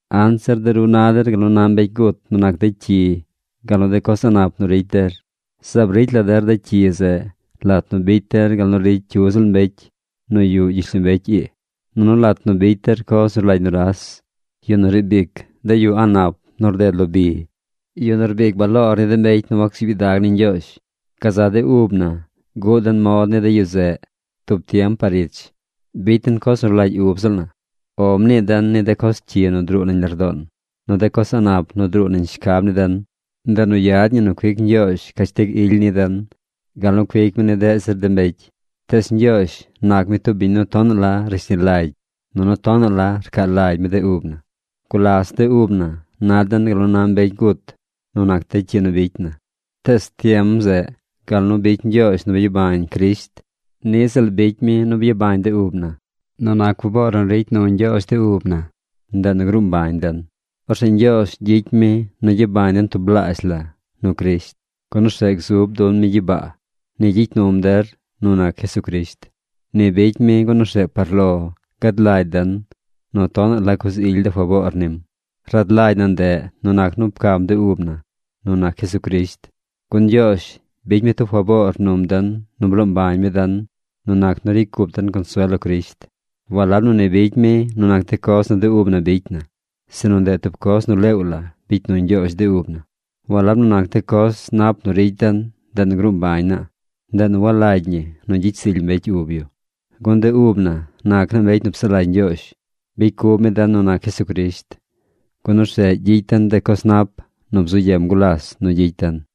Anzir de ru na der gal nu na mbecy gut nu nac de cyi gal nu de coz a̱ꞌ nap nu ricy der. Zaab ricy la der de cyi zeꞌ lat nu bicy der gal nu ricy cyu ziꞌl mbecy nu yuꞌ gyishlombecy ii, nunu lat nu bicy der coz nu rlagy nuras, yu nu riib ic de yu a̱ꞌ nap nu rded lo bi, yu nu rbic baloor ni de mbecy nu wacsuub gyidag ni Ñgyoozh. Gazaꞌ de ub na guꞌ den mod ni de yu zeꞌ tub tiem par ich. Bicy den coz nu rlagy ub ziꞌl na. “O” mnii den ni de coz cyi nu druu nañ lardoon, nu de coz a̱ꞌ nap nu druu nañ shcab ni den. Ndeꞌ nu yad ñi nu cuic Ñgyoozh cashtig ily ni den gal nu cuic mi ni deꞌ zir de mbecy. Tees Ñgyoozh nac mi tub biñ nu tonaꞌ la rashni lagy nunu tonaꞌ la rcaa lagy mi de ub na. Gulas de ub na na den gal nu na mbecy gut nu nac de cyi nu bicy na. Tees tiem zeꞌ gal nu bicy Ñgyoozh nu byabañ Crisht, niꞌ ziꞌl bicy mi nu byabañ de ub na. Nu nac faboor nu ricy nu Ñgyoozh de ub na, ndeꞌ nu gruu mbañ den. Orzeꞌ Ñgyoozh gyicy mi nu gyabañ den tublaazh la nu Crisht, gun orzeꞌ gzub dun mi gyibaa. Ni gyicy num der nu nac Jesucrisht. Ni bicy mi gun orzeꞌ par lo gad lagy den nu tonaꞌ la coz ily de faboor nim. Rad lagy na ndeꞌ nu nac nu pcam de ub na nu nac Jesucrisht. Gun Ñgyoozh bicy mi tub faboor num den nu bloo mbañ mi den nu nac nu ricy cup den consuel lo Crisht. Walab nu ni bicy mi nu nac de coz nu de ub na bicy na, sinu ndeꞌ tub coz nu leew la bicy nu Ñgyoozh de ub na. Walab nu nac de coz nap nu ricy den, ndeꞌ nu gruu mbañ naa. Ndeꞌ nu walagy ñi nu gyicy zily mbecy ub yu. Gun de ub na nac naa mbecy nu psaꞌ lagy Ñgyoozh. Bicy cub mi den nu nac Jesucrisht, gun orzeꞌ gyicy den de coz nap nu bzu yem gulas nu gyicy den.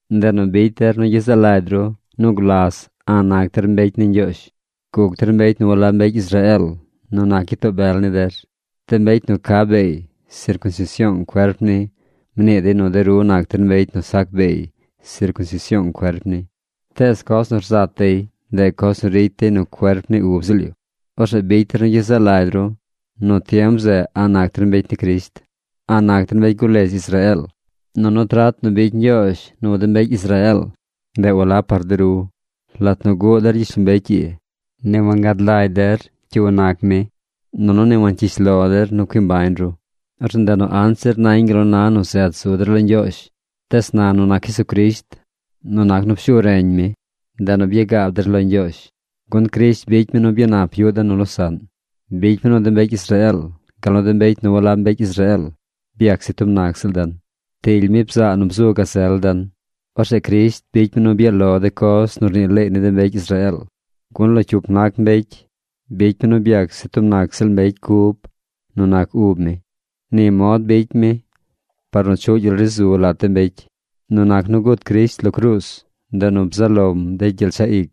Ndeꞌ nu bicy der nu gyezaꞌ lagy ru nu gulas a̱ꞌ nac der mbecy ni Ñgyoozh. Guc der mbecy nu walab mbecy Israeel nu nac gyitoo bel ni der. De mbecy nu ca beey sircunsision cuerp ni mnii dey nu de ru nac der mbecy nu sac beey sircunsision cuerp ni. Tees coz nu rzat dey, ndeꞌ coz nu ricy dey nu cuerp ni ub ziꞌl yu. Orzeꞌ bicy der nu gyezaꞌ lagy ru nu tiem zeꞌ a̱ꞌ nac der mbecy ni Crisht. A̱ꞌ nac der mbecy guledz Israeel. Nunu trat nu bicy Ñgyoozh nu de mbecy Israeel, ndeꞌ walab par de ru. Lat nu guꞌ der gyishlombecy ii, ni wangad lagy der cyu nac mi, nunu ni wancyish lo der nu cui mbañ ru. Orzeꞌ ndeꞌ nu anzir nañ gal nu na nu zet zu der lo Ñgyoozh. Tees na nu nac Jesucrisht, nu nac nu pshu reñ mi, ndeꞌ nu byagaab der lo Ñgyoozh. Gun Crisht bicy mi nu byanap yuꞌ den nu losaꞌn. Bicy mi nu de mbecy Israeel, gal nu de mbecy nu walab mbecy Israeel byac se tub nac ziꞌl den. Ptily mi bzaa nu bzu gazel den. Orzeꞌ Crisht bicy mi nu byaꞌ lo de coz nu rnii leey ni de mbecy Israeel. Gun lo cyup nac mbecy bicy mi nu byac se tub nac ziꞌl mbecy cub nu nac ub mi. Ni mod bicy mi par nu chuꞌ gyel ri zu lat de mbecy. Nu nac nu gut Crisht lo cruuz, ndeꞌ nu bzaꞌ lom de gyel chaꞌ ic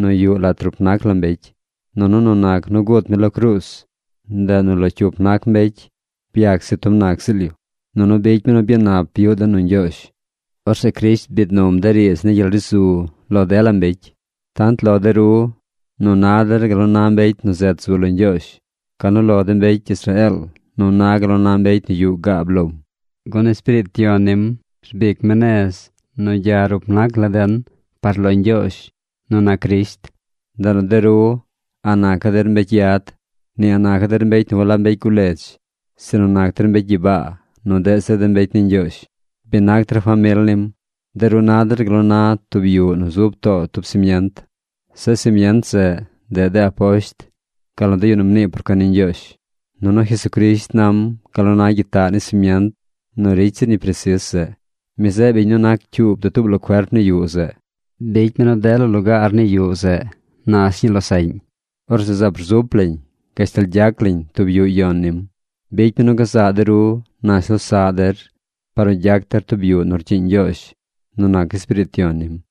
nu yuꞌ lat rup nac la mbecy. Nunu nu nac nu gut mi lo cruuz, ndeꞌ nu lo cyup nac mbecy byac se tub nac ziꞌl yu, nunu bicy mi nu byanap yuꞌ dey nu Ñgyoozh. Orzeꞌ Crisht biid num de riidz ni gyel ri zu lo dela mbecy: tant lo de ru nu na der gal nu na mbecy nu zet zu lo Ñgyoozh, gal nu lo de mbecy Israeel nu na gal nu na mbecy nu yuꞌ gaab lom. Gun Espiriit Yon nim rbic mi nez nu gya rup nac la den par lo Ñgyoozh nu nac Crisht. Ndeꞌ nu de ru a̱ꞌ nacaꞌ der mbecy yad, ni a̱ꞌ nacaꞌ der mbecy nu walab mbecy guledz, sinu nac der mbecy gyibaa nu deꞌ zir de mbecy ni Ñgyoozh. Bi nac der famil nim. De ru na der gal nu na tub yuꞌ nu zub too tub simient. Zeꞌ simient zeꞌ, ndeꞌ de aposht gal nu de yu nu mnii por cuen ni Ñgyoozh. Nunu Jesucrisht nam gal nu na gyitaꞌ ni simient nu ricy zir ñi presis zeꞌ. Mi zeꞌ biñ nu nac cyuub dutuub la cuerp ni yuꞌ zeꞌ. Bicy mi nu dela lugaar ni yuꞌ zeꞌ nash ñii losaꞌñ. Orzeꞌ zaab rzup lañ gashtal gyac lañ tub yuꞌ yon nim. Bicy mi nu gazaꞌ de ru nash losaꞌ der par nu gyac der tub yuꞌ nu rcyiiñ Ñgyoozh nu nac Espiriit Yon nim.